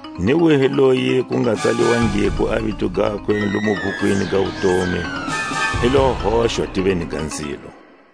Ni wihi loyi ku nga tsaliwangiko a vito gakwe lomu bhukwini ga wutomi, i lo hoxwa tiveni ga nzilo.